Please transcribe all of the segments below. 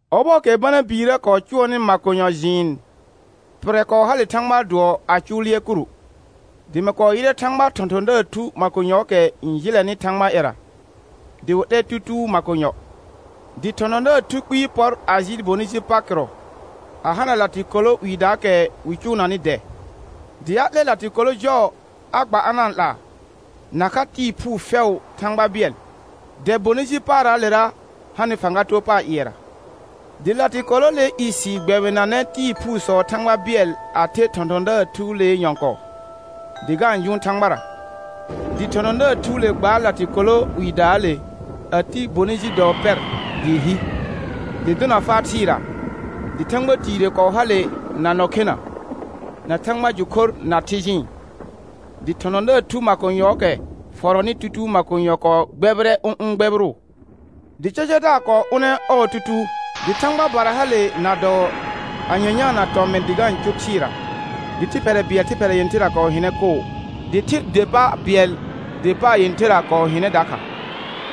Ɔbɔɔkɛ Bana biirə kɔɔ cʋɔrnɩ makonyɔ jɩɩn, pɩrrɛ kɔɔ hale Thãgbaa dʋɔ a cʋ lɩɛr kuru. Dɩ mɩ kɔɔ yɩrɛ Thãgbaa thɔ̃thɔ̃daar thu makonyɔɔkɛ n jɩlɛnɩ Thãgbaa ƴɛra, dɩ wɩ 'lɛr tutuu makonyɔ. Dɩ thɔ̃thɔ̃daar thu kpɩɩ pɔr a jɩɩl bonɩ ji pa kɩrɔ, a hana latɩkolo 'wiidaakɛ wɩ cʋʋnanɩ dɛ; dɩ a 'lɛr latɩkolo jɔɔ a gba a na-n 'laa, nakha tɩɩ phuu fɛʋʋ Thãgba bɩɛl, dɛ bonɩ ji paarraalera hanɩ fãga too pa ƴɩɛra. Dɩ latɩkoloolee isi gbɛbɩnanɛ tɩɩ phuusɔɔ Thãgba bɩɛl a the thɔ̃thɔ̃daar thuulee nyɔ̃kɔɔ, dɩ ga-n jʋʋn Thãgbara. Dɩ thɔ̃thɔ̃daar thuule gbaar latɩkolo 'wiidaale a ti bonɩ ji dɔɔ pɛr dɩɩ hi, dɩ dʋna faa thɩɩra, dɩ thãgba tiire kɔɔ hale na nɔ khena, na thãgba jʋ khor na thɩ jɩɩn. Dɩ thɔ̃thɔ̃daar thu makonyɔɔkɛ fɔrɔnɩ tutuu makonyɔ kɔɔ gbɛbɩrɛ ʋ̃ ʋ̃ gbɛbɩrʋʋ. Dɩ cacadaar kɔɔ ʋnɛ ɔɔ tutuu, dɩ thãgba bara hale na dɔɔ a nyanyaana tɔmɩn dɩ ga-n cʋr thɩɩra, dɩ thɩ phɛrɛ bɩɛl thɩ phɛrɛ yẽtherra kɔɔ hɩnɛ koo, dɩ thɩr der pa bɩɛl der paar yẽtherra kɔɔ hɩnɛ dakha,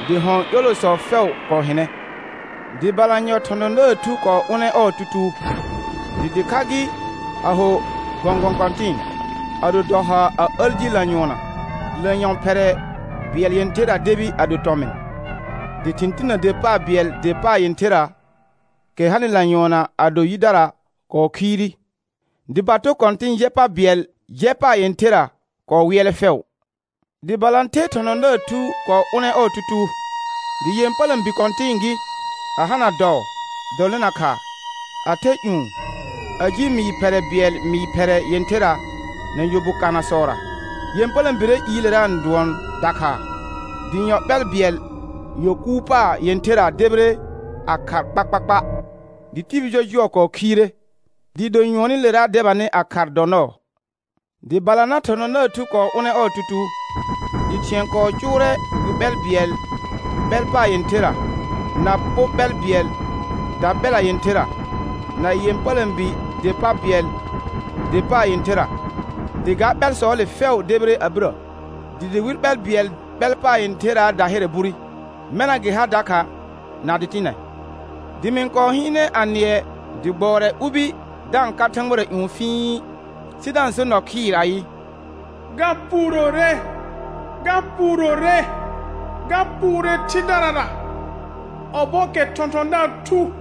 dɩ hɔ̃ ƴolosɔ fɛʋ kɔɔ hɩnɛ. Dɩ balanyɔ thɔ̃thɔ̃daar thu kɔɔ ʋnɛ ɔɔ tutuu, dɩ dɩkha gɩ, a ho gɔ̃gɔ̃ kɔ̃tɩ̃ɩ, a do dɔ haar, a əl ji lanyʋɔnna, dɩ lanyɔ̃ phɛrɛ bɩɛl yẽtherra debi a do tɔmɩn. Dɩ thɩ̃ tinə der pa bɩɛl der paar yẽtherra, kɛ hanɩ lanyʋɔnna a do yidara kɔɔ khiire, dɩ bato kɔ̃tĩ jɛ pa bɩɛl jɛ paar yẽtherra kɔɔ wɩɛlɛ fɛʋ. Dɩ balãther thɔ̃thɔ̃daar thu kɔɔ ʋnɛ ɔɔ tutuu, dɩ ƴepələ̃bi kɔ̃tɩ̃ɩ gɩ, a hana dɔɔ dɔlɩna khaa, a the ƴũ, a ji mɩɩr phɛrɛ bɩɛl mɩɩr phɛrɛ yẽtherra na yɔ bu kanasɔra. Ƴepələ̃biree iilera n dʋɔn Dakhaa, dɩ yɔ ɓɛl bɩɛl yɔ kuur paar yẽtherra debire a khar kpakpakpa, dɩ tibil jɔjʋɔ kɔɔ khiire, dɩɩ do nyʋɔnɩlera debanɩ a khar dɔ nɔɔ. Dɩ balanã thɔ̃thɔ̃daar thu kɔɔ ʋnɛ ɔɔ tutuu, dɩ thɩ̃ɛ kɔɔ cʋʋrɛ wi ɓɛl bɩɛl ɓɛl paar yẽtherra, na po ɓɛl bɩɛl daɓɛla yẽtherra, na ƴepələ̃bi der pa bɩɛl der paar yẽtherra, dɩ ga ɓɛlsɔɔle fɛʋ debire a birə, dɩ dɩwɩl ɓɛl bɩɛl ɓɛl paar yẽtherraa dahɩrɛ bure, mɛna gɩ ha dakha na dɩtɩnɛ. Dɩ mɩ-n kɔɔ hɩɩnɛ a nɩɛ dɩ gbʋɔrɛ ubi da-n ka thãgbara ƴũ fii, sɩ da-n so nɔ khɩɩr ayɩ: Ga puurore, ga puurore, ga puure thɩdarara ɔbɔɔkɛ thɔ̃thɔ̃daar thu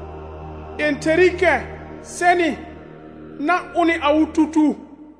yẽtherɩkɛ sɛnɩ na ʋnɩ awɩ tutuu.